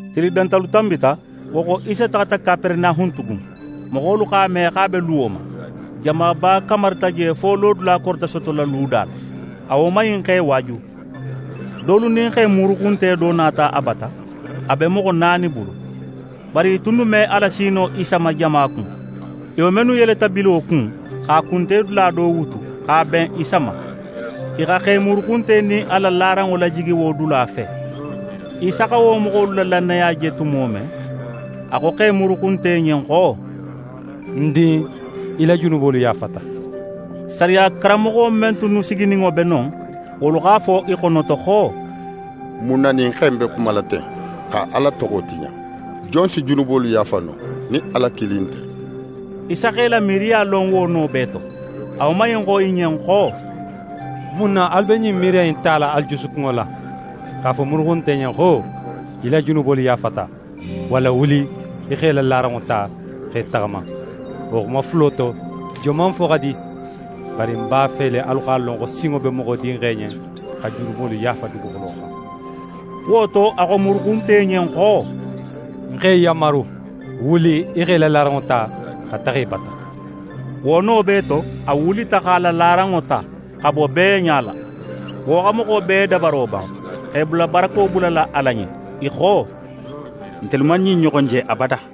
Tili dantalu tanbita. Wo xo, Isa taxata Kaperenahun tugun. Moxolu x'a me xo a be luwo ma. Jamaba kamarita je fo lodula korita sotola luda la. A woman in x'e waaju. Dolu nin xe muruxunte do nata a bata, a be moxo naani bulu. Bari i tunnu me a lasi no Isa ma jama kun. I woman innu yeleta bilo kun, x'a kunte dula do wutu x'a ben Isa ma. I xa xe muruxunte nin a la laranŋo lajigi wo dula fe. Isa xa wo moxolu la lannaya je tumo men, a xo xe muruxunte ɲen xo: «Ń din, í la junubolu yaafata.» Sariya karanmoxo men tunnu sigininŋo be non, wolu x'a fo i xonoto xo: «Mun na ɲin xe in be xumala ten, xa Ala toxo tiɲa? Jon si junubolu yaafa no nin Ala kilin nte?» Isa x'e la miiriya lon wo no bee to, a woman in xo i ɲen xo: «Mun na alu be ɲin miiriya in tala alu jusukunŋo la? X'a fo muruxunte ɲen xo: “Í la junubolu yaafata,” walla: “Wuli, í x'é la laranŋo ta, x'é taxama.” Wo xuma fulo to joman fo xa di? Bari ń b'a fe le alu x'a lon xo sinŋo be Moxo Dinxe ɲen xa junubolu yaafa duguxulo xan». Wo to, a xo muruxunte ɲen xo: «Ń x'é yanmaru, wuli, í x'é la laranŋo ta, xa taxa í bata!» Wo no bee to, a wulita x'a la laranŋo ta, xa bo bee ɲala. Wo xa moxo bee dabaro ban, x'e bula barako bulala Ala ɲen. I xo: «Ntelu man ɲin ɲoxon je abada.»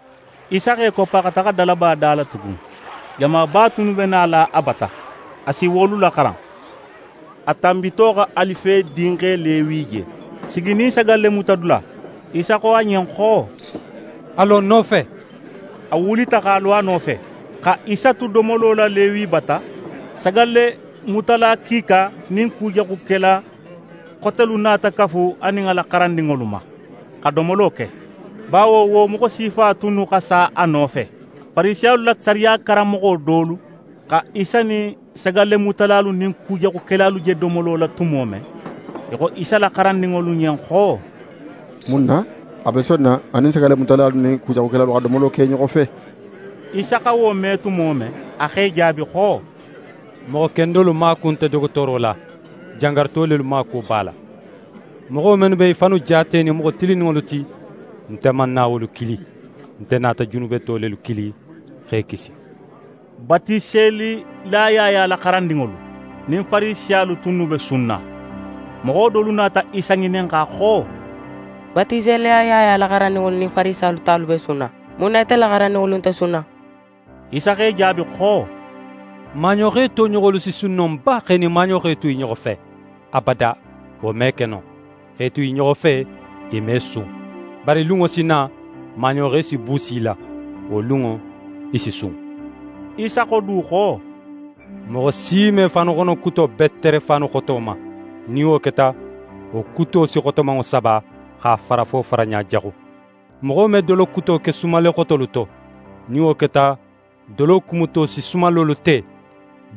Isa x'é koppa xa taxa dalaba da la tugun. Jamaba tunnu be nala a bata, a si wolu laxaran. A tanbito xa Alife dinxe Lewi je siginin sagallemutadula. Isa xo a ɲen xo: «A lo ń nofe.» A wulita x'a lo a nofe. Xa Isa tu domolo la Lewi bata, sagallemutala kiika nin kujaxukela xotelu nata kafu a nin a la xarandinŋolu ma, xa domolo ke. Bawo wo moxo sifa tunnu xa sa a nofe. Farisiyalu la sariya karanmoxo dolu xa Isa nin sagallemutalalu nin kujaxukelalu je domolo la tumo men, i xo Isa la xarandinŋolu ɲen xo: «Mun na a be sonna a nin sagallemutalalu nin kujaxukelalu xa domolo ke i ɲoxo fe?» Isa xa wo me tumo men, a x'e jaabi xo: «Moxo kendolu maaku nte dogotooro la; jangaruto lelu maakuwo b'a la. Moxo mennu be i fannu jaatenin moxo tilinninŋolu ti, nte man na wolu kili, nte nata junubeto lelu kili, x'e kisi.» Batiselila Yaya la xarandinŋolu nin Farisiyalu tunnu be sunna. Moxo dolu nata Isa ŋininxa xo: «Batiselila Yaya la xarandinŋolu nin Farisiyalu talu be sunna; mun na ite la xarandinŋolu nte sunna?» Isa x'e jaabi xo: «Maaɲoxe toɲoxolu si sun no ba x'e nin maaɲoxe tu i ɲoxo fe? Abada, wo me ke no. X'e tu i ɲoxo fe, i me sun. Bari lunŋo si na, maaɲoxe si buusi i la; wo lunŋo, i si sun.» Isa xo du xo: «Moxo si me faanuxono kuto betere faanu xoto ma. Nin wo keta, wo kuto si xotomanŋo saba, x'a fara fo faraɲa jaxu. Moxo me dolo kuto ke sumalle xotolu to. Nin wo keta, dolo kumuto si sumallolu te;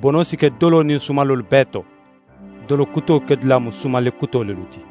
bono si ke dolo nin sumallolu bee to. Dolo kuto kedula mu sumalle kuto lelu ti.»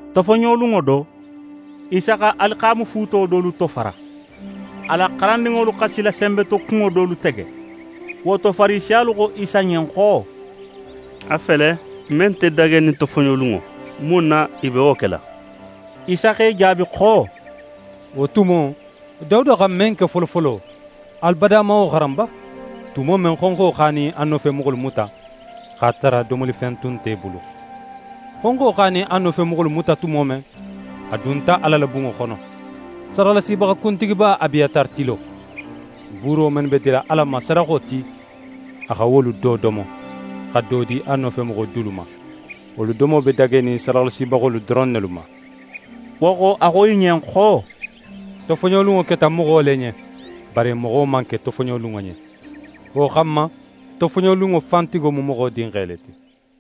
Tofoɲolunŋo do, Isa xa alixaamafuuto dolu tofara. A la xarandinŋolu xa silasenbetokunŋo dolu tege. Wo to, Farisiyalu xo Isa ɲen xo: «A fele, men nte dagenin tofoɲolunŋo, mun na i be wo kela?» Isa x'e jaabi xo: «Wo tumo, Dawuda xa men ke folofolo, alu bada man wo xaran ba, tumo men, xonxo x'a nin a nofemoxolu muta, x'a tara domolifen tun nte i bulu? Xonxo x'a nin a nofemoxolu muta tumo men, a dunta Ala la bunŋo xono, sadaxalasibaxa kuntigiba Abiyatari tilo. Buuro mennu be dila Ala ma sadaxo ti, a xa wolu do domo, xa do di a nofemoxo dulu ma. Wolu domo be dagenin sadaxalasibaxolu doron nelu ma.» Wo xo, a xo i ɲen xo: «Tofoɲolunŋo keta moxo le ɲen; bari moxo man ke tofoɲolunŋo ɲen. Wo xanma, tofoɲolunŋo fan tigo mu Moxo Dinxe le ti.»